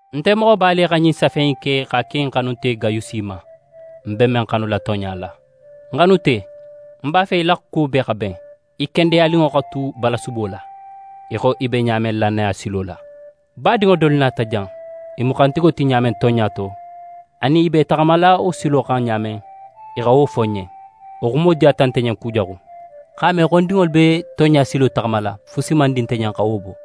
Nte Moxoba le xa ɲin safe in ke x'a ki ń xanunte Gayusi ma, ń be men xanula tonɲa la. Ń xanunte, ń b'a fe í la kuwo bee xa ben, í kendeyaninŋo xa tu balasubo la, í xo í be ɲa men lannaya silo la. Badinŋo dolu nata jan; í mu xantigo ti ɲa men tonɲa to, anin í be í taxamala wo silo xan ɲa men, i xa wo fo ń ɲen. Wo xumo diyata nte ɲen kujaxu. X'a me xo ń dinŋolu be tonɲa silo taxamala, fusi man di nte ɲen xa wo bo.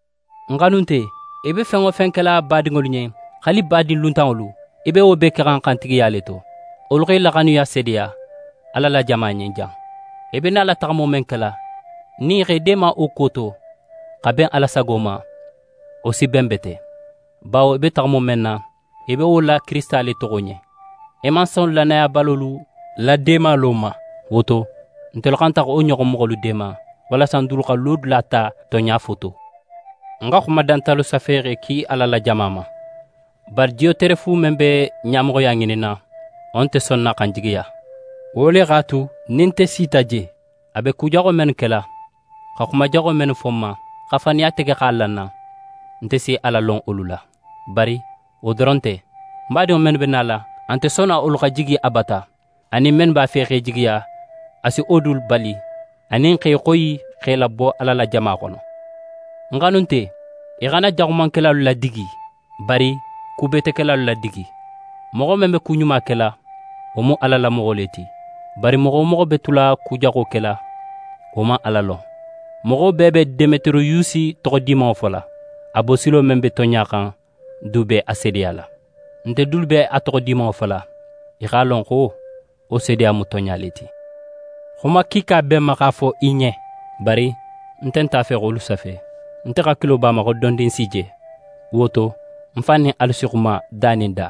Ń xanunte, í be fen wo fen kela badinŋolu ɲen, haali badin luntanŋolu, í be wo bee kexan xantigiya le to. Wolu xa í la xanuya seedeya Ala la jama ɲen jan. I be nala taxamo men kela, nin í x'e deema wo kuwo to x'a ben Ala sago ma, wo si ben bete. Bawo i be taxamo men na, i be wo la Kirisita le toxo ɲen, i man son lannayabalolu la deemalo ma. Wo to, ntelu xanta xa wo ɲoxon moxolu deema, walasa n dulu xa lodula ta tonɲa fo to. Ń xa xuma dantalu safe x'e ki Ala la jama ma. Bari Diyoterefu men be ɲamoxoya ŋininna, wo nte sonna xa n jigiya. Wo le x'a tu, nin nte sita je, a be ku jaxo mennu kela, xa xuma jaxolu fo n ma, xa faniya tege x'a la n na, nte si a lalon wolu la: Bari wo doron nte, badinŋo mennu be nala, a nte sonna wolu xa jigi a bata, anin mennu b'a fe x'e jigiya, a si wo dulu bali, anin x'e xoyi x'e labo Ala la jama xono. Ń xanunte, í xana jaxumankelalu ladigi, bari kubetekelalu ladigi. Moxo men be ku ɲuma kela, wo mu Ala la moxo le ti, bari moxo wo moxo be tula ku jaxo kela, wo man Ala lon. Moxo bee be Demetiriyusi toxo dimanŋo fola. A bosilo men be tonɲa xan du be a seedeyala. Nte dulu be a toxo dimanŋo fola, í x'a lon xo wo seedeya mu tonɲa le ti. Xuma kiika be ń ma x'a fo í ɲen, bari ń nte a fe xa wolu safe. Nte hakilo b'a ma xo dondin ń s'í je. Wo to, ń fan nin alu si xuma da nin da.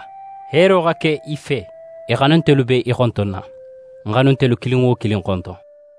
Heero xa ke í fe. Í xanuntelu be í xontonna. N xanuntelu kilin wo kilin xonton.